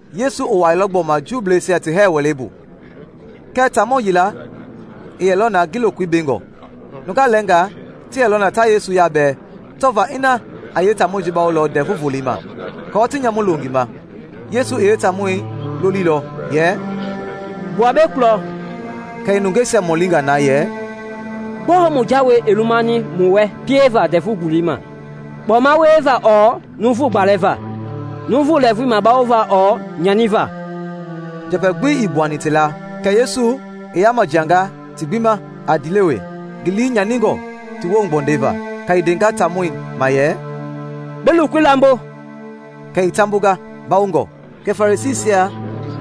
Yesu i wuailɔ gbɔma Juubleisia ti hɛɛ wɛlei bu, kɛɛ taamɔ yila i yɛlɔ na ngi lokoi bengɔ. Nungaa lɛɛnga ti yɛlɔ na ta Yesu yabɛɛ tɔva ina a yeetaamɔi bawolɔ Ndɛvu Volei ma, aako ti nyamu lo ngi ma. Yesu i yeetaamɔi lolilɔ yɛ, “Gbua mbei kulɔ.” Kɛ i nungeisia mɔlinga na yɛ, “Gbɔɔ mu jawei i lumani mu wɛ pieva Ndɛvu Volei ma? Kpɔma wieva ɔɔ numu gbalɛva? Numu lɛɛvui bawova ɔɔ nyaniva?” Njɛpɛ gbi ii gbuani ti la. Kɛ Yesu i yama jianga ti gbi ma a ndiilewe, ngi lii nyaningɔ ti woohugbɔndɛi va; kɛ i ndenga taamɔi ma yɛ, “Bi lokoi lambo.” Kɛ i taambonga, mbawongɔ. Kɛ Farisiisia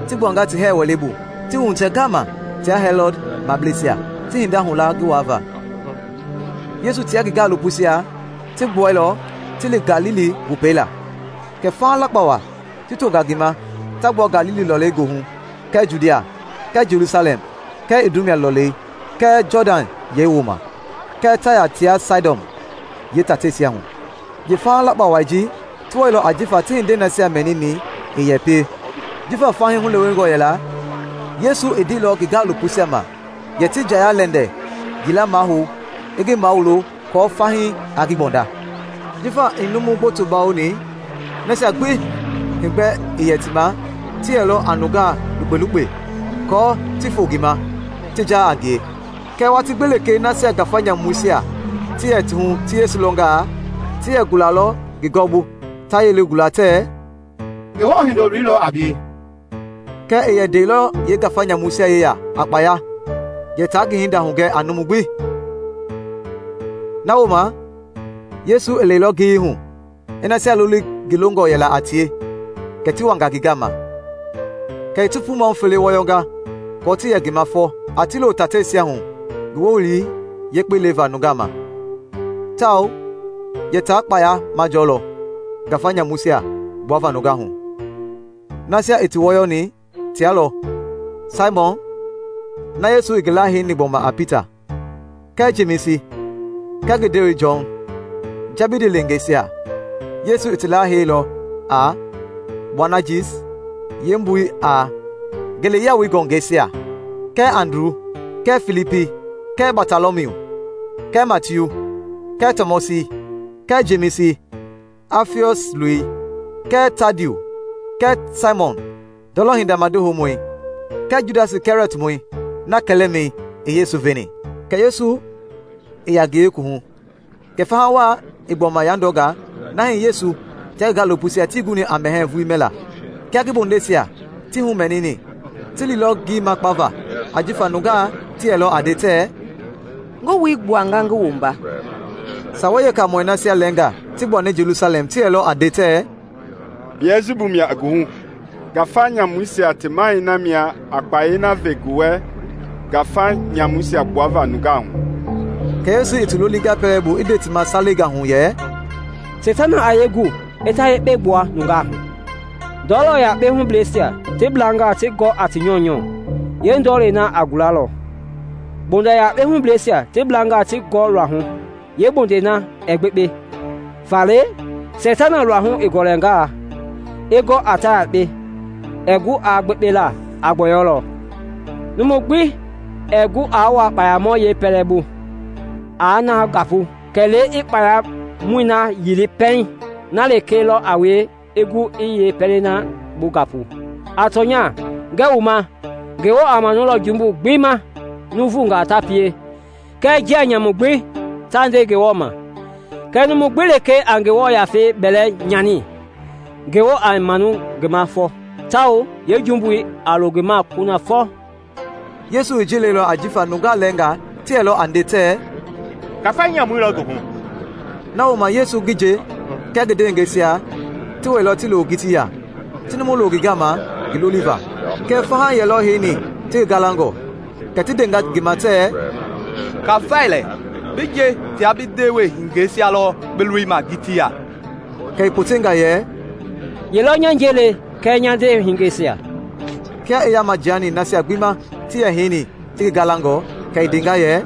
ti gbuanga ti hɛɛ wɛlei bu, ti wuhitɛ ngama tia Hɛlɔd mableisia, ti hinda hula ngi waava. Yesu tia ngi gaalopoisia ti gbuɛilɔ ti li Galili Wopei la, kɛ faha lakpa wa ti tonga ngi ma ta gbua Galili lɔlei goohu kɛɛ Judia, kɛɛ Jelusalɛm kɛɛ Idumia lɔlei kɛɛ Jɔdan yɛi wooma, kɛɛ Taya tia Saidɔn yeetateisia hu. Yeefaha lakpa wai ji ti wailɔ ajifa ti hindei nasia mɛnini i yɛ pie. Jifa fahii hulewengɔ yɛla, Yesu i ndeilɔ ngi gaalopoisia ma yɛ ti njaya-lɛndɛ yila mahou i ngi mawulo kɔɔ fahii aa ngi gbɔnda. Jifa i numu gboto bawoni, nasia gbi heegbɛ yɛ ti ma ti yɛlɔ a nungaa lukpe-lukpe aako ti foo ngi ma, ti jaa a ngie. Kɛɛ watii gbi lekee nasia ngafa nyamuisia ti yɛ ti hu ti Yesu lɔnga, ti yɛ gulalɔ ngi gɔwɔbu, ta yelei gula tɛɛ, “Ngewɔ Hindoloi lɔ a bie!” Kɛɛ i yɛ ndalɔ yeengafa nyamuisia yeya a kpaya yɛ ta ngi hinda hugɛ a numu gbi. Na wooma Yesu i lɛilɔ ngiyei hu, i nasia loli ngi longɔ yɛla a tie, kɛ ti wanga ngi gama. Kɛ i ti puu mahu fele wɔyɔnga kɔɔ ti yɛ ngi ma fɔ, a ti lo tateisia hu ngi wowili yekpei leva nungaa ma, tawao yɛ ta kpaya majɔlɔ ngafa nyamuisia gbuava nungaa hu. Nasia i ti wɔyɔni tia lɔ: Saimɔn (na Yesu i ngi laaheini gbɔma a Pita); kɛɛ Jemisi kɛɛ ngi ndewei Jɔn, Jɛbidi leengeisia; (Yesu i ti laheilɔ a Boanajis, yeembui a “Ngeleyiawoi Ngɔngɛisia”;) kɛɛ Andru kɛɛ Filipi kɛɛ Batɔlɔmiu kɛɛ Matiu kɛɛ Tɔmɔsi kɛɛ Jemisi, Afiɔs loi, kɛɛ Tadiu kɛɛ Saimɔn ndɔlɔ hinda madi houmɔi, kɛɛ Judasi Kɛriɔtmɔi, na kɛlɛmɛi i Yesu veni. Kɛ Yesu i ya ngi yeekuwuhu. Kɛ faha wa i gbɔma yandɔnga na hii Yesu tia ngi gaalopoisia tii guni a mɛhɛɛ vulii mɛla. Kia ngi bondeisia ti humɛnini, ti liilɔ ngi makpava ajifa nungaa ti yɛlɔ a nde tɛɛ, “Ngi wui gbuanga ngi wumba.” Sawei Yeekaamɔi nasia lɛɛngaa ti gbuani Jelusalɛm ti yɛlɔ a nde tɛɛ, “Biɛlsibu mia i ngi hu! Ngafa nyamuisia ti mahɛi na mia a kpayei na ve ngi wɛ ngafa nyamuisia gbuava nungaa hu.” Kɛ Yesu i ti lolinga pɛlei bu i nde ti ma salengaa hu yɛ, “Seitana a yee gu i ta yekpe gbua nungaa hu? Ndɔlɔ yakpei hubleisia ti blangaa ti gɔ a ti nyɔunyɔ, yeendɔɔlɛi na a gulalɔ. Mbonda yakpei hubleisia ti blangaa ti gɔ luahu, yeembondei na ɛɛ gbekpe. Faale, Seitana luahu i gɔlɛngaa, i gɔ a ta yekpe, ɛɛ gu aa gbekpe, a gbɔyɔlɔ. Numu gbi ɛɛ gu aa wua kpayamɔ yeepɛlɛbu aa na gapu, kɛlee a kpayamɔi na yili pɛiŋ; na lekee lɔ a wie i gu i yeepɛlei na bu gapu.” “A tɔnya, ngɛɛ wu ma, Ngewɔ a manulɔ jumbu gbi ma nuuvungaa ta pie kɛɛ njia nyamu gbi ta nde Ngewɔ ma. Kɛɛ numu gbi lekee a Ngewɔ Yafei bɛlɛ nyani, Ngewɔ ɛɛ manu ngi ma fɔ, tawao yeejumbui a lo ngi ma lɔ kunafɔ.” Yesu i ji leilɔ ajifa nungaa lɛɛngaa ti yɛlɔ a nde tɛɛ, “Ngafa nyamui lɔ ngi hu.” Na wooma Yesu ngi nje kɛɛ ngi ndewehingeisia ti wɛilɔ ti lo ngitii ya, ti numu lo ngi gama ngi loliva. Kɛɛ faha yɛlɔ heini ti ngi galangɔ; kɛ ti ndenga ngi ma tɛɛ, “Kafai lɛ, bi nje tia bi ndewehingeisia lɔ bi lolima ngitii ya.” Kɛ i potenga yɛ, “Ye lɔ nya nje le kɛɛ nya ndewehingeisia?” Kia i yama jiani nasia gbi ma ti yɛ heini ti ngi galangɔ, kɛ i ndenga yɛ,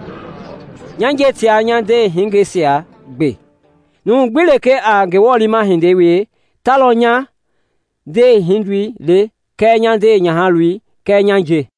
“Nya nje tia nya ndewehingeisia gbe! Numu gbi lekee a Ngewɔ liima hindei wie ta lɔ nya ndewehindoi le kɛɛ nya ndewenyahaloi kɛɛ nya nje.”